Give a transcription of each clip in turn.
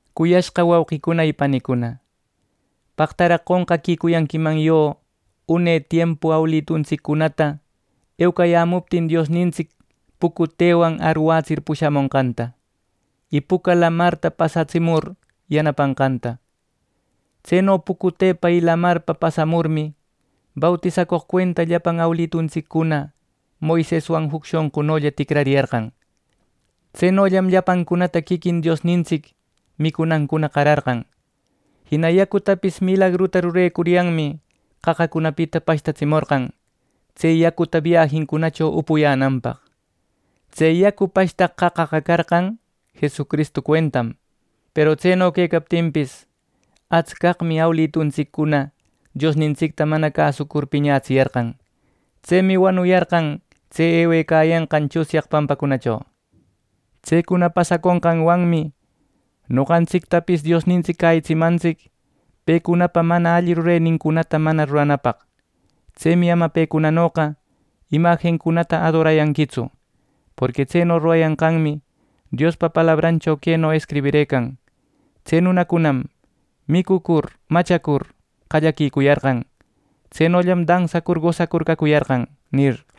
Cuyashqa wauqicuna y panicuna, paqtaraq qonqaquicuyanquiman yo une tiempu awiluntsicunata eucayämuptin Diosnintsic pucutewan arwätsir pushamonqanta, y Puca Lamarta pasatsimur yanapanqanta. Tseno pucutepa y lamarpa pasamurmi, bautisacoq cuenta llapan awilituntsiccuna Moiseswan juc shonqunolla ticrariyarqan. Tsenollam llapancunata quiquin Diosnintsic micunancuna qararqan. Jina yacutapis milagruta rurecuryanmi qaqacunapita pashtatsimorqan tse yacuta biajincunacho upuyänanpaq. Tse yacu pashtaq qaqaqa carqan Jesucristu cuentam. Peru tseno quecaptinpis, atscaqmi awilituntsiccuna Diosnintsicta mana cäsur piñätsiyarqan. Tsemi wanuyarqan tse ewecayanqan tsunyaq pampacunacho. Tsecuna pasaconqanwanmi noqantsictapis Diosnintsic cäyitsimantsic pecunapa mana alli rurenincunata mana ruranapaq. Tsemi ama pecunanoqa imajincunata adorayanquitsu. Porqui tseno rurayanqanmi Diospa palabrancho queno escribirëcan: “Tse nunacunam micucur machacur qallaquicuyarqan. Tsenollam dansacur gosacur cacuyarqan” nir.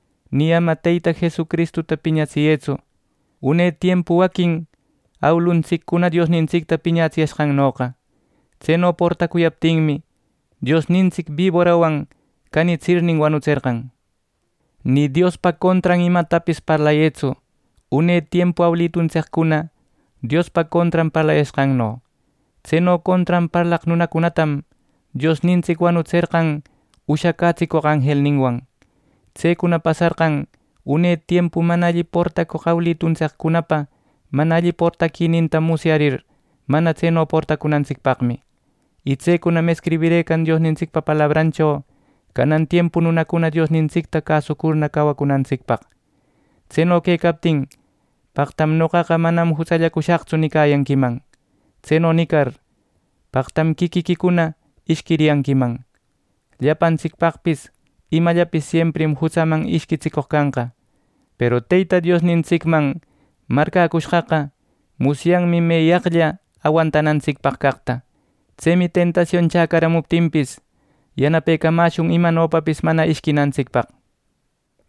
Nï ama Teyta Jesucristuta piñatsiyëtsu, une tiempu waquin awiluntsiccuna Diosnintsicta piñatsiyashqannoqa. Tseno portacuyaptinmi, Diosnintsic biborawan canitsirnin wanutserqan. Ni Diospa contran imatapis parlayëtsu, une tiempu awiluntsiccuna Diospa contran parlayashqanno. Tseno contran parlaq nunacunatam Diosnintsic wanutserqan ushacätsicoq anjelninwan. Tsecuna pasarqan une tiempu mana alli portacoq awiluntsiccunapa mana alli portaquininta musyarir, mana tseno portacunantsicpaqmi, y tsecunam escribirëcan Diosnintsicpa palabrancho canan tiempu nunacuna Diosnintsicta cäsucurna cawacunantsicpaq. Tseno quecaptin paqtam “Noqaqa manam jutsallacushaqtsu” nicayanquiman. Tseno nicar paqtam quiquiquicuna ishquiriyanquiman. Llapantsicpaqpis imallapis siemprim jutsaman ishquitsicoq canqa. Peru Teyta Diosnintsicman marcäcushqaqa musyanmi meyaqlla awantanantsicpaq caqta. Tsemi tentasion chacaramuptinpis, yanapecamäshun imanopapis mana ishquinantsicpaq.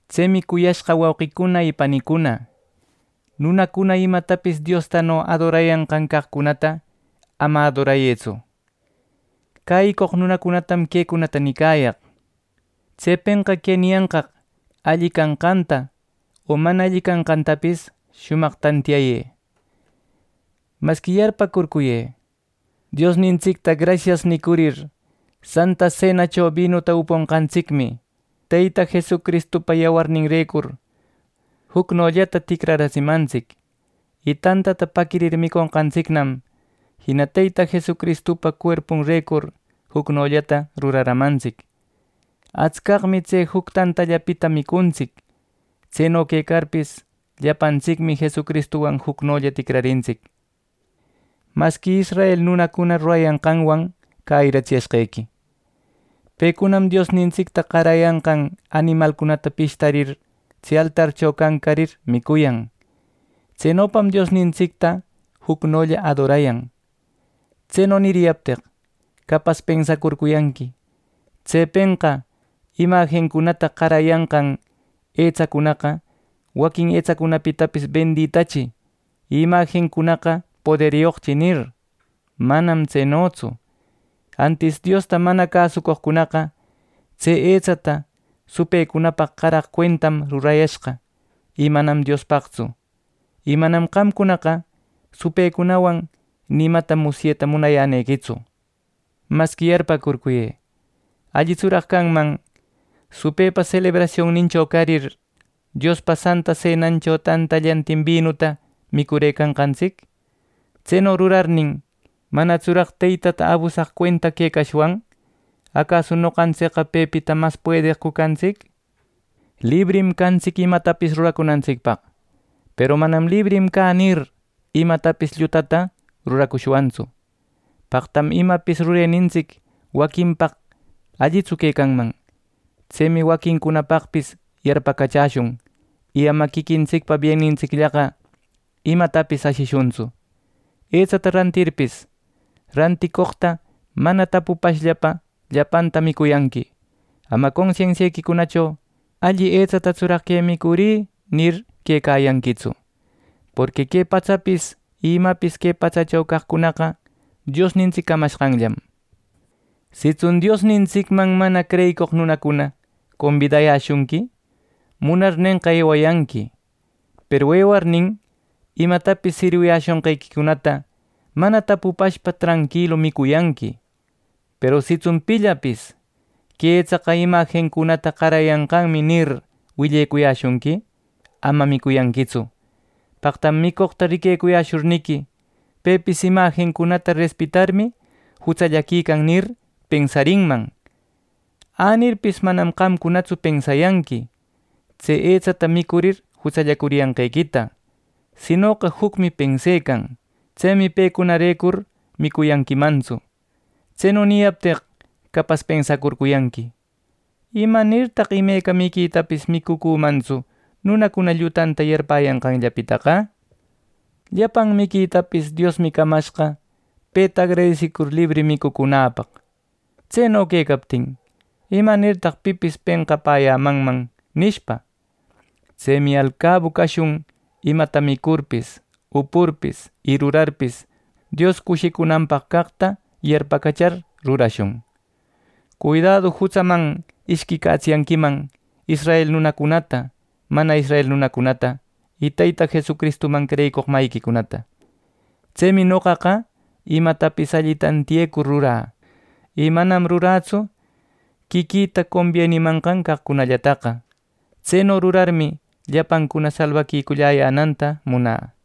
Tsemi, cuyashqa wauqicuna y panicuna, nunacuna imatapis Diostano adorayanqan caqcunata ama adorayëtsu. Cäyicoq nunacunatam quecunata nicayaq. Tsepenqa que niyanqaq alli canqanta o mana alli canqantapis shumaq tantiyayë. Masqui yarpäcurcuyë: Diosnintsicta “Grasias” nicurir, Santa Senacho binuta uponqantsicmi Teyta Jesucristupa yawarninrecur jucnollata ticraratsimantsic, y tantata paquirir miconqantsicnam jina Teyta Jesucristupa cuerpunrecur jucnollata ruraramantsic. Atscaqmi tse juc tantallapita micuntsic. Tseno quecarpis, llapantsicmi Jesucristuwan jucnolla ticrarintsic. Masqui israel nunacuna rurayanqanwan cäyiratsiyashqequi: Pecunam Diosnintsicta qarayanqan animalcunata pishtarir tse altarcho cancarir micuyan. Tsenopam Diosnintsicta jucnolla adorayan. Tseno niriyapteq capas pensacurcuyanqui: “Tsepenqa imajincunata qarayanqan etsacunaqa waquin etsacunapitapis benditachi y imajincunaqa poderyoqchi” nir. ¡Manam tsenotsu! Antis Diosta mana cäsucoqcunaqa tse etsata supëcunapaq qaraq cuentam rurayashqa y manam Diospaqtsu. Y manam qamcunaqa supëwan ni imata musyeta munayänequitsu. Masqui yarpäcurcuyë, ¿Allitsuraq canman supëpa selebrasionnincho carir, Diospa Santa Senancho tantallantin binuta micurëcanqantsic? Tseno rurarnin, ¿manatsuraq Teytata abusaq cuenta quecashwan! ¿Acasu noqantsicqa pepita mas puedeqcu cantsic! Librim cantsic imatapis ruracunantsicpaq, peru manam “Librim cä” nir, imatapis llutata ruracushwantsu. Paqtam imapis rurenintsic waquinpaq allitsu quecanman. Tsemi waquincunapaqpis yarpacachäshun, y ama quiquintsicpa biennintsicllaqa imatapis ashishuntsu. Etsata rantirninpis, ranticoqta mana tapupashpa llapanta micuyanqui. Ama consensiequicunacho “¿Alli etsatatsuraq que micurï?” nir, quecayanquitsu. Porqui “Que patsapis y imapis que patsacho caqcunaqa, Diosnintsic camashqanllam.” Sitsun Diosnintsicman mana creyicoq nunacuna combidayäshunqui, munarnenqa ewayanqui; peru ewarnin, imatapis sirwiyäshonqequicunata mana tapupashpa tranquilu micuyanqui. Peru sitsun pillapis “Que etsaqa imajincunata qarayashqanmi” nir, willecuyäshunqui, ama micuyanquitsu; paqtam micoqta riquecushurniqui, “Pepis imajincunata respetarmi jutsalliquican” nir, pensarinman. Änirpis manam qamcunatsu pensayanqui tse etsata micurir jutsallacuriyanqequita; sinoqa jucmi pensecan. Tsemi pecunarecur micuyanquimantsu. Tseno niyapteq capas pensacurcuyanqui “¿Imanirtaq imeca miquitapis micucümantsu, nunacuna llutanta yarpäyanqanllapitaqa? Llapan miquitapis Diosmi camashqa peta agradesicur libri micucunäpaq. Tseno quecaptin, ¿imanirtaq pipis penqapäyämanman?” nishpa. Tsemi alcabu cashun imata micurpis, upurpis y rurarpis Dios cushicunanpaq caqta yarpacachar rurashun. Cuidadu jutsaman ishquicatsiyanquiman israel nunacunata, mana israel nunacunata y Teyta Jesucristuman creyicoq mayiquicunata. Tsemi noqaqa imatapis alli tantiyecuryan rurä, y manam rurätsu quiquïta combienimanqan caqcunallataqa. Tseno rurarmi, llapancuna salbaquiculläyänanta munä.